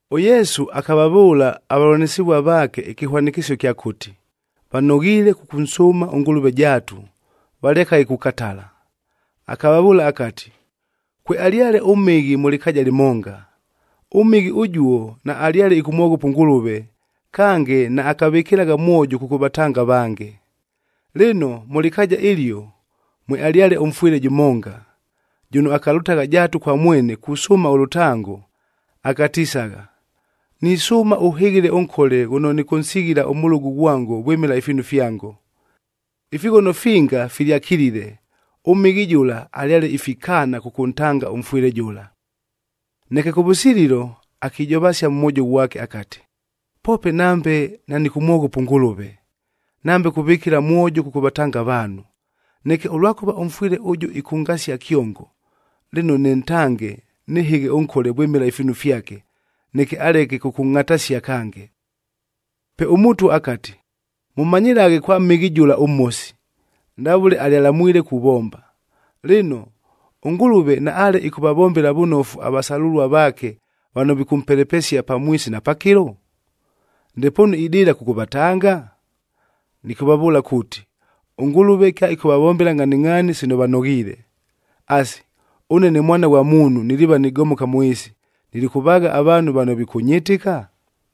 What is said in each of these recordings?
ɄYesu akavavʉʉla avavʉlanɨsɨvua vaake ɨkɨhwanɨkɨsio ɨkya kuuti, vanoghiile kʉkʉnsʉʉma ʉNgʉlʉve jaatu, valekaghe kukatala. Akavavʉʉla akati, “Kwealyale ʉmhɨghi mʉ lɨkaaja lɨmonga. Ʉmhɨghi ʉjuo, naalyale ɨkʉmwoghopa ʉNgʉlʉve, kange naakavɨkɨlagha mwojo kʉkʉvatanga avange. Lɨno, mʉ lɨkaaja ɨlio, mwealyale ʉmfwɨle jʉmonga, jʉno akalʉtagha jaatu kwa mwene kusʉʉma ʉlʉtango, akatisagha, ‘Nisʉʉma ʉhɨghɨle ʉnkole ghʉno nɨkʉnsighila ʉmʉlʉgʉ ghwango vwɨmɨla ifiinu fyango.’ “Ifighono finga filyakilile, ʉmhɨghi jʉla alyale ifikaana kʉkʉntanga ʉmfwɨle jʉla. Neke kʉvʉsililo, akijovasia mʉ mwojo ghwake akati, ‘Poope nambe nanɨkʉmwoghopa ʉNgʉlʉve, nambe kuvɨkɨla mwojo kʉkʉvatanga avaanhu, neke ʉlwakʉva ʉmfwɨle ʉjʉ ɨkʉngasia kyongo, lɨno nɨntange nɨhɨghe ʉnkole vwɨmɨla ifiinu fyake, neke aleke kʉkʉngʼhatasia kange!’” Pe ʉMʉtwa akati, “Mʉmanyɨlaghe kwa mhɨghi jʉla ʉmhosi, ndavʉle alyalamwile kuvomba! Lɨno, ʉNgʉlʉve, naale ɨkʉvavombela vʉnofu avasalʉlua vaake vano vikʉmpelepesia pamwisi na pakɨlo? Ndepoonu idɨɨla kʉkʉvatanga? Nɨkʉvavʉʉla kuuti, ʉNgʉlʉve kyaɨkʉvavombela ngʼhaningʼhaani sino vanoghiile. Asi, ʉne ne Mwana ghwa Muunhu niliiva nigomoka mʉ ɨɨsi, nilikʉvaagha avaanhu vano vikʉnyɨtɨka?”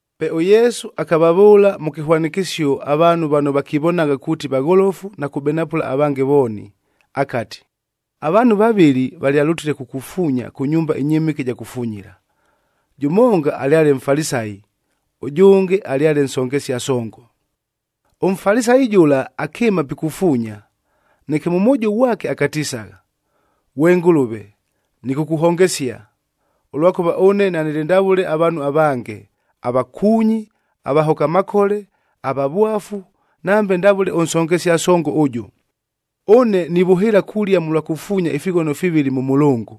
Pe ʉYesu akavavʉʉla mʉ kɨhwanɨkɨsio, avaanhu vano vakivonagha kuuti vagholofu na kubenapʉla avange vooni, akati, “Avaanhu vavɨlɨ valyalʉtile kukufuunya kʉ nyumba ɨnyɨmɨke ɨja kufunyila, jʉmonga alyale Mfalisayi, ʉjʉnge alyale nsongesia songo. ɄMfalisayi jʉla akɨɨma pikufuunya, neke mʉ mwojo ghwake akatisagha, ‘Ghwe Ngʉlʉve, nɨkʉkʉhongesia, ʉlwakʉva ʉne nanɨlɨ ndavʉle avaanhu avange, avakuunyi, avahoka makole, avavwafu, nambe ndavʉle ʉnsongesia songo ʉjʉ! Ʉne nivʉhɨɨla kulia mʉlwa kufuunya ifighono fivɨlɨ mʉ mʉlʉngʉ.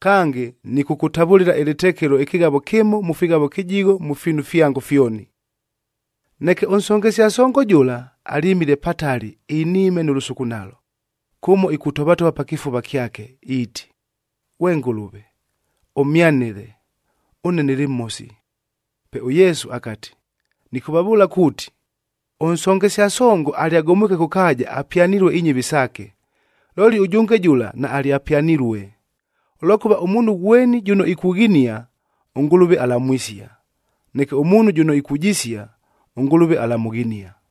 Kange, nɨkʉkʉtavʉlɨla ɨlɨtekelo ɨkɨghavo kɨmo mʉ fighavo kɨjigho mʉ fiinu fyango fyoni.’ “Neke ʉnsongesia songo jʉla, alyɨmile patali iniime nʉ lʉsukunalo, kʉmo ikutovatova pa kɨfuva kyake, iiti, ‘Ghwe Ngʉlʉve, ʉmhyanɨle, ʉne nɨlɨ mhosi!’” Pe ʉYesu akati, “Nɨkʉvavʉʉla kuuti, ʉnsongesia songo alyagomwike kʉ kaaja, apyanilue inyɨvi saake. Looli ʉjʉnge jʉla naalyapyanilue! Ʉlwakʉva, ʉmuunhu ghweni jʉno ikughinia, ʉNgʉlʉve alamwisia; neke ʉmuunhu jʉno ikujisia, ʉNgʉlʉve alamʉghinia.”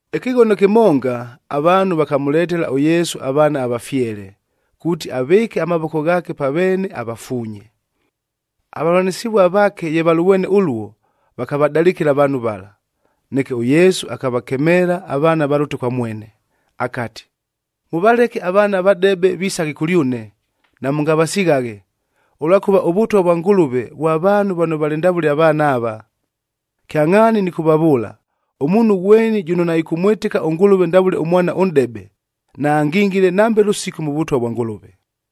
Ɨkɨghono kɨmonga, avaanhu vakamʉletela ʉYesu avaana avafyele, kuuti avɨɨke amavoko ghaake pa veene avafuunye. Avavʉlanɨsɨvua vaake ye valʉvwene ʉluo, vakavadalɨkɨla avaanhu vala. Neke ʉYesu akavakemeela avaana valʉte kwa mwene, akati, “Mʉvaleke avaana avadebe visaghe kʉlyʉne, namʉngavasighaghe, ʉlwakʉva ʉVʉtwa vwa Ngʉlʉve vwa vaanhu vano valɨ ndavʉle avaana ava. Kyangʼhaani nɨkʉvavʉʉla, ʉmuunhu ghweni jʉno naɨkʉmwɨtɨka ʉNgʉlʉve ndavʉle ʉmwana ʉnʼdebe,a naangingile nambe lʉsiku mʉ Vʉtwa vwa Ngʉlʉve.”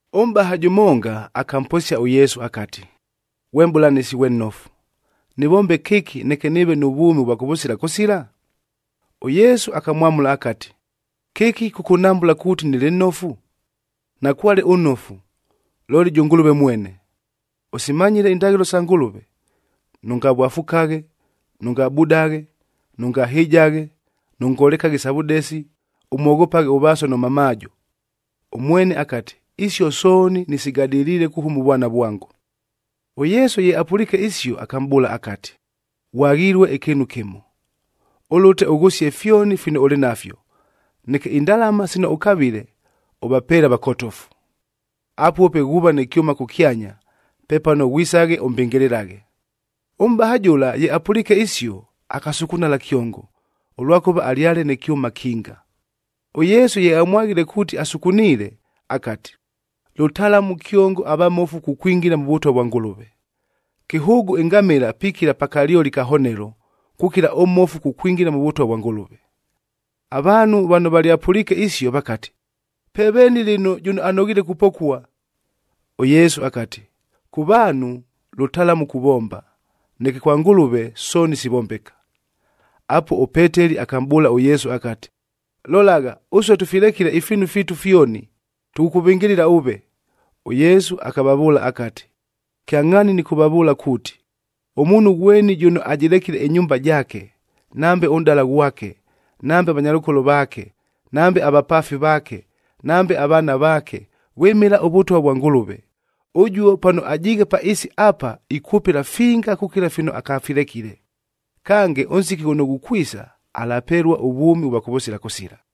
Ʉmʼbaha jʉmonga, akamposia ʉYesu akati, “Ghwe Mʼbʉlanɨsi ghwe nnofu, nɨvombe kɨki neke nɨɨve nʉ vwʉmi ʉvwa kʉvʉsila kʉsila?” ɄYesu akamwamʉla akati, “Kɨki kʉkʉnhambʉla kuuti nɨlɨ nnofu? Nakwale ʉnnofu, looli jʉ Ngʉlʉve mwene! Ʉsimanyile indaghɨlo isa Ngʉlʉve: ‘Nʉngavwafukaghe, nʉngabudaghe, nʉngahɨjaghe, nʉngolekaghe isa vʉdesi, ʉmwoghopaghe ʉvaaso nʉ mamaajo.’b” Ʉmwene akati, “Isio sooni, nɨsigadɨliile kuhʉma ʉvwana vwango.” ɄYesu ye apʉliike isio, akamʼbʉʉla akati, “Ghwaghilue ɨkɨɨnu kɨmo. Ʉlʉte ʉghʉsie fyoni fino ʉlɨ nafyo, neke indalama sino ʉkavile ʉvapeele avakotofu. Apuo pe ghuuva nɨ kyʉma kʉkyanya. Pepano ghwisaghe ʉmbɨngɨlɨlaghe.” Ʉmʼbaha jʉla, ye apʉliike isio, akasukunala kyongo, ʉlwakʉva alyale nɨ kyʉma kinga. ɄYesu ye amwaghile kuuti asukuniile, akati, “Lʉtalamu kyongo avamofu kukwingila mʉ Vʉtwa vwa Ngʉlʉve! Kɨhʉʉgʉ ɨngamɨla pikila pa kalyoli ka honelo, kukila ʉmmofu kukwingila mʉ Vʉtwa vwa Ngʉlʉve!” Avaanhu vano valyapʉliike isio, vakati, “Pe veeni lɨno, jʉno anoghiile kupokua?” ɄYesu akati, “Kʉ vaanhu, lʉtalamu kuvomba, neke kwa Ngʉlʉve sooni sivombeka.” Apuo, ʉPeteli akamʼbʉʉla ʉYesu akati, “Lolagha, ʉsue tʉfilekile ifiinu fiitu fyoni, tʉkʉkʉvɨngɨlɨla ʉve!” ɄYesu akavavʉʉla akati, “Kyangʼhaani nɨkʉvavʉʉla kuuti, ʉmuunhu ghweni jʉno ajɨlekile ɨnyumba jaake, nambe ʉnʼdala ghwake, nambe avanyalʉkolo vaake, nambe avapaafi vaake, nambe avaana vaake, vwɨmɨla ʉVʉtwa vwa Ngʉlʉve, ʉjuo pano ajiighe pa ɨɨsi apa ikwʉpɨla finga kukila fino akafilekile. Kange, ʉnsiki ghʉno ghukwisa, alapelua ʉvwʉmi ʉvwa kʉvʉsila kʉsila.”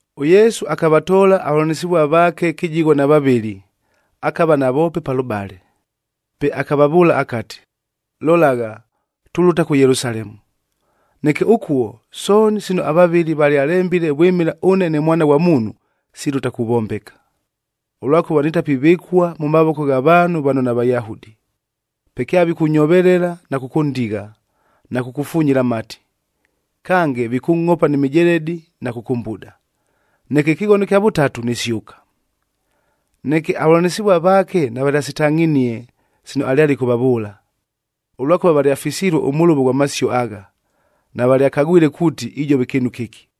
ɄYesu akavatoola avavʉlanɨsɨvua vaake kɨjigho na vavɨlɨ, akava navoope palʉbale, pe akavavʉʉla akati, “Lolagha, tulʉta kʉ Yelusalemu. Neke ʉkuo, sooni sino avavɨli valyalembile vwɨmɨla ʉne ne Mwana ghwa Muunhu, silʉta kuvombeka. Ʉlwakʉva nitapivɨkua mʉ mavoko gha vaanhu vano naVayahudi. Pe kyavikʉnyovelela na kʉkʉndigha, na kʉkʉfunyila amati. Kange, vikʉngʼhopa ni mijeledi na kʉkʉmbuda. Neke ɨkɨghono ɨkya vʉtatu, nisyʉka.” Neke avavʉlanɨsɨvua vaake navalyasitangʼhinie sino alyale ɨkʉvavʉʉla, ʉlwakʉva valyafisilue ʉmʉlʉvo ghwa masio agha. Navalyakagwile kuuti ijova kɨɨnu kɨki.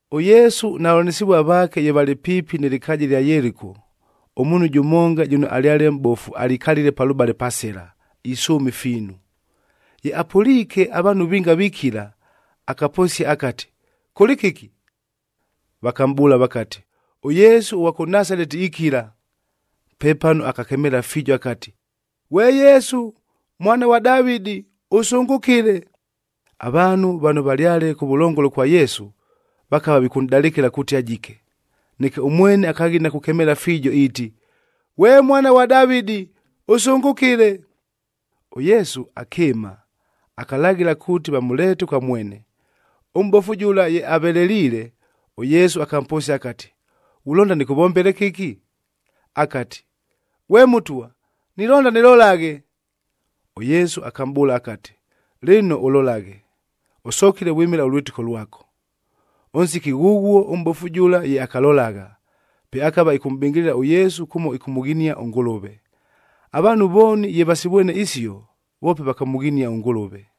ɄYesu na vavʉlanɨsɨvua vaake ye valɨ piipi nɨ lɨkaaja ɨlya Yeliko, ʉmuunhu jʉmonga jʉno alyale mʼbofu alikalile palʉbale pa sɨla, isʉʉma ifiinu. Ye apʉliike avaanhu vinga vikila, akaposia akati, “Kʉlɨ kɨki?” Vakamʼbʉʉla vakati, “ɄYesu ʉghwa kʉ Nasaleti ikila.” Pepano akakemeela fiijo akati, “Ghwe Yesu, Mwana ghwa Davɨdi,c ʉsʉngʉkɨle!” Avaanhu vano valyale kʉvʉlongolo kwa Yesu, vakava vikʉnʼdalɨkɨla kuuti ajike. Neke ʉmwene akaghina kukemeela fiijo iiti, “Ghwe Mwana ghwa Davɨdi, ʉsʉngʉkɨle!” ɄYesu akɨɨma, akalaghɨla kuuti vamʉleete kwa mwene. Ʉmʼbofu jʉla ye aveleliile, ʉYesu akamposia akati, “Ghulonda nɨkʉvombele kɨki?” Akati, “Ghwe Mʉtwa, nilonda nɨlolaghe.” ɄYesu akamʼbʉʉla akati, “Lɨno ʉlolaghe! Ʉsokile vwɨmɨla ʉlwɨtɨko lwako.” Ʉnsiki ghʉghuo ʉmʼbofu jʉla ye akalolagha, pe akava ɨkʉmʼbɨngɨlɨla ʉYesu kʉmo ɨkʉmʉghinia ʉNgʉlʉve. Avaanhu vooni ye vasivwene isio, voope vakamʉghinia ʉNgʉlʉve.